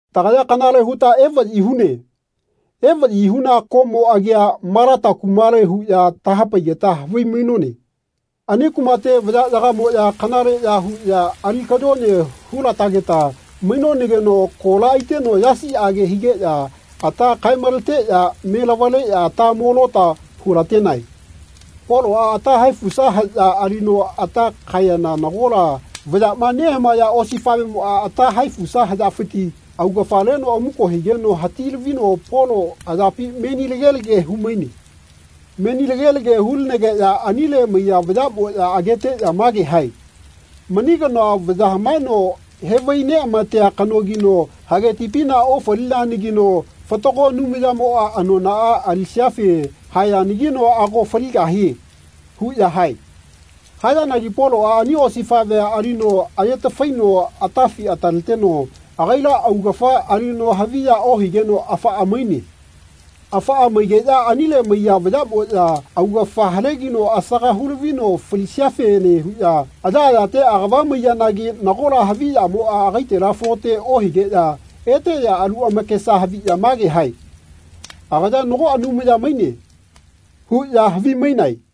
Tagaya kanale huta evaꞌyi hune. Evaꞌyi huna koꞌmo agia Malata kumale huꞌya tahapaigeta havimainone. Ani kumate vayaꞌyagamoꞌya kanaleꞌya huꞌya ali kayone hulatageta mainonageno kola aiteno yasiꞌage higeꞌya ata kae-maleteꞌya me lavaleꞌya ata mo lota hulatenae. Poloꞌa ata haefusa haꞌya alino ata kaeyana nagola vayaꞌma nehaeya osifaꞌvemoꞌa ata haefusa haꞌyafiti augafa leno amuko higeno hati-lavino Polo ayapi menilage-lage humaine. Menilage-lage hulinegeꞌya anile maiya vayaꞌmoꞌya ageteꞌya mage hae “Mani kanoa vaya hamaeno hevai-neꞌamatea kanogino hage tipina ofalianagino fatago Anumayamoꞌa anonaꞌa alisiafe haeyanagino ago faligahie.” huꞌya hae. Hayanagi Poloꞌa ani osifaꞌvea alino aye-tafaino atafi ataleteno agaila augafa alino haviya ohigeno afaꞌa maine. Afaꞌa maigeꞌya anile maiya vayaꞌmoꞌya augafa halegino asaga hulavino falisiafene huꞌya ayaꞌayate agava maiyanagi nagola havi yamoꞌa agaitela falote ohigeꞌya eteꞌya alu amakesa haviꞌya mage hae “Agaya nago Anumaya maine.” huꞌya havimainae.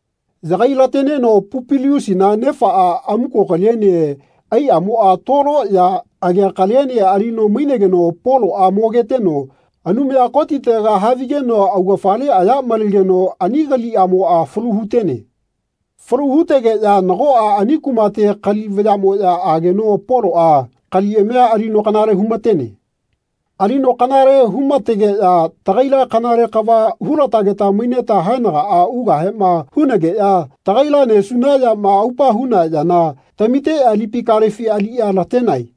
Yagai-lateneno Pupiliusina nefaꞌa amuko kaliene aiꞌamoꞌa tolo ya agea kaliene alino mainegeno Poloꞌa mo-geteno Anumaya Kotitega havigeno augafale aya malegeno ani kaliꞌamoꞌa falu hu-tene. Falu hutegeꞌya nagoꞌa ani kumate kali vayaꞌmoꞌya ageno Poloꞌa kaliꞌamia alino kanale humatene. Alino kanale humategeꞌya tagaila kanale kava hulatageta maineta haenagaꞌa ugahema hunageꞌya tagaila nesuna yama aupa huna yana tamiteꞌya tipi kalefi aliꞌya latenae.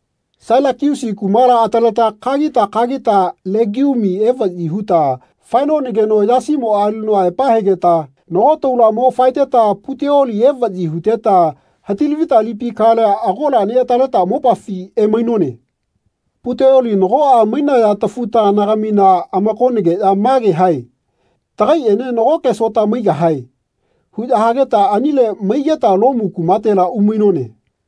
Sailakiusi kumala ataleta kagita kagita Legiumi evaꞌyi huta faenonageno yasimoꞌa alino aepa hegeta nagoke taula mo faeteta Puteoli evaꞌyi huteta hati-lavita lipi kalea agola neꞌataleta mopafi emainone. Puteoli nagoꞌa mainaya tafu-taganagamina amakonageꞌya mage hae “Tagaiꞌene nagoke sota maigahae.” huꞌya hageta anile maigeta Lomu kumatela umainone.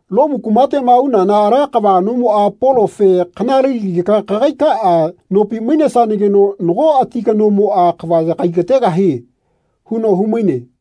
Lomu kumateꞌma unana ala kava kanomoꞌa Polofe “Kanalelagika kagaikaꞌa nopi mainesanageno nago ati kanomoꞌa kava yagaigategahie.” huno humaine.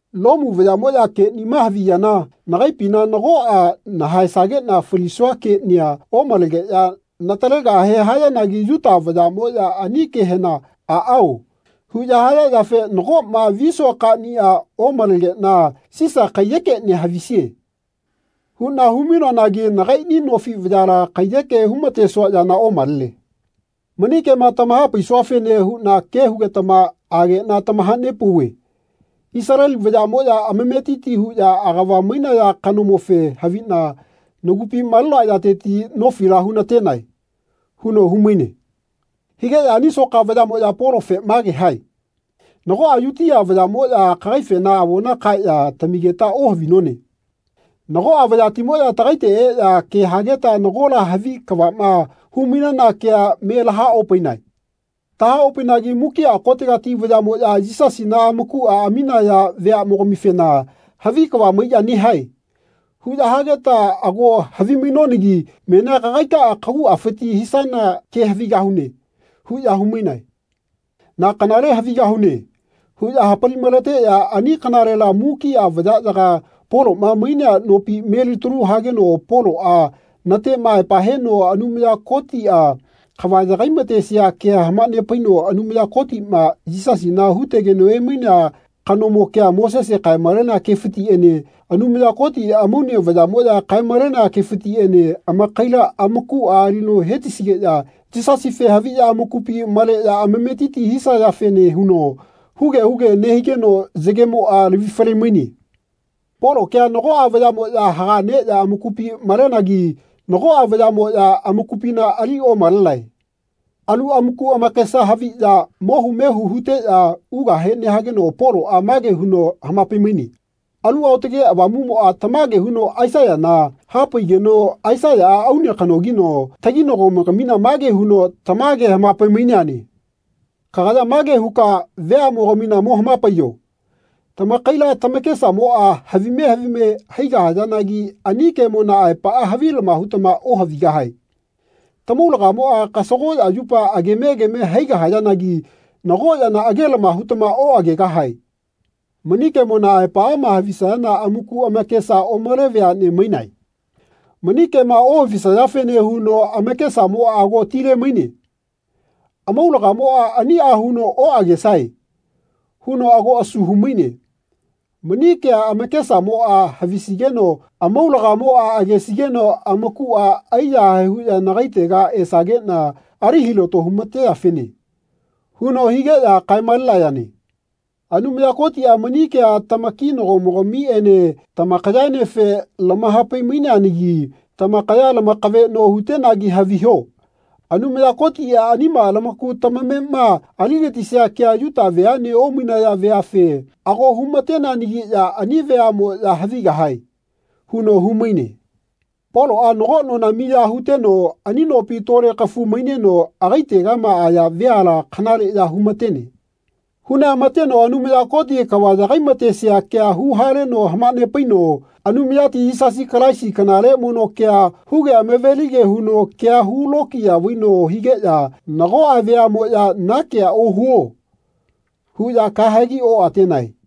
Lomu vayaꞌmoꞌya keꞌnima haviyana nagaipina nagoꞌa nahaesageꞌna falisua keꞌnia omalegeꞌya natalegahe hayanagi Yuta vayaꞌmoꞌya ani kehena ‘Aꞌaoꞌ huꞌya haya yafe nagoꞌma visua kaniꞌa omalegeꞌna ‘Sisa kaiyekeꞌnia havisie.’ huꞌna humainoanagi nagaiꞌni nofi vayala kaiyeke humatesua yana omalene. Mani kema tamahapaisuafene huꞌna ke hugetama ageꞌna tamahanepauve Isaleli vayaꞌmoꞌya amametiti huꞌya agava mainaya kanomofe haviꞌna nagupi malenoa yateti nofila hunatenae.” huno humaine. Higeꞌya ani soka vayaꞌmoꞌya Polofe mage hae “Nagoꞌa Yutia vayaꞌmoꞌya kagaifena avona kaeꞌya tamigeta ohavinone. Nagoꞌa vayatimoꞌya tagaite eꞌya ke hageta nagola havi kavaꞌma humainana kea me lahaopainae. Tahaopainagi mukiꞌa kotegati vayaꞌmoꞌya Yisasina amakuꞌa aminaya veaꞌmogamifena ‘Havi kava maiꞌya nehae.’ huꞌya hageta ago havimainonagi menia kagaikaꞌa kaguꞌafiti hisana ke havigahune.” huꞌya humainae. “Na kanale havigahune.” huꞌya hapali-maleteꞌya ani kanalela mukiꞌa vayaꞌyaga Poloꞌma mainea nopi me-litalu hageno Poloꞌa natema aepa heno Anumaya Kotiꞌa kava yagai-matesia kea hamanepaino Anumaya Kotiꞌma Yisasina hutegeno emainea kanomo kea Mosese kae-malenea kefitiꞌene Anumaya Koti amaune vayaꞌmoꞌya kae-malenaya kefitiꞌene amakaila amakuꞌa alino hetisigeꞌya Yisasife haviꞌya amakupi maleꞌya amametiti hisayafene huno huge huge nehigeno yagemoꞌa lavi fale-maine. Polo kea nagoꞌa vayaꞌmoꞌya haga neꞌya amakupi malenagi nagoꞌa vayaꞌmoꞌya amakupina ali omalenae. Alu amaku amakesa haviꞌya mohu mehu huteꞌya ugahe nehageno Poloꞌa mage huno hamapai-maine “Alu Aotage Avamuꞌmoꞌa tamage huno Aisaiyana hapaigeno Aisaiyaꞌa, aune kanogino, taginagomogamina mage huno tamage hamapai-maineane. Kagaya mage huka veaꞌmogamina mo hamapaiyo ‘Tamakaila tamakesamoꞌa havime havime haigahayanagi ani kemona aepaꞌa havilama hutama ohavigahae. Tamaulagamoꞌa kasagoꞌya yupa ageme ageme haigahayanagi nago yana agelama hutama oꞌagegahae. Mani kemona aepaꞌama havisaya amaku amakesa omale veaꞌne mainae. Mani kema ohavisayafene huno amakesamoꞌa ago tile-maine. Amaulagamoꞌa aniꞌa huno ‘Oꞌagesae.’ huno ago asu humaine. Mani kea amakesamoꞌa havisigeno amaulagamoꞌa agesigeno amakuꞌa aiyahae huꞌya nagaitega esageꞌna ali hilato humateyafene.’ huno higeꞌya.” kae-malenayane. “Anumaya Kotiꞌa mani kea tamakinagomogamiꞌene tamakayaenefe lamaha-pai-maineanagi tamakaya lamakaveꞌno hutenagi haviho Anumaya Kotiꞌa anima lamaku tamamema aligatisia kea Yuta veaꞌne omainaya veafe ago humateneanagiꞌya ani veaꞌmoꞌya havigahae.” huno humaine. Poloꞌa nago nona miya huteno ani nopi tole kafu maineno agaitegama aya veala kanaleꞌya humatene. Huneꞌamateno Anumaya Koti kava yagaimatesia kea huhaleno hamanepaino Anumayati Yisasi Kalaisi kanale mono kea huge amavelige huno kea hulokiya vaino higeꞌya nagoꞌa veaꞌmoꞌya “Na kea ohuo.” huꞌya kahegi oꞌatenae.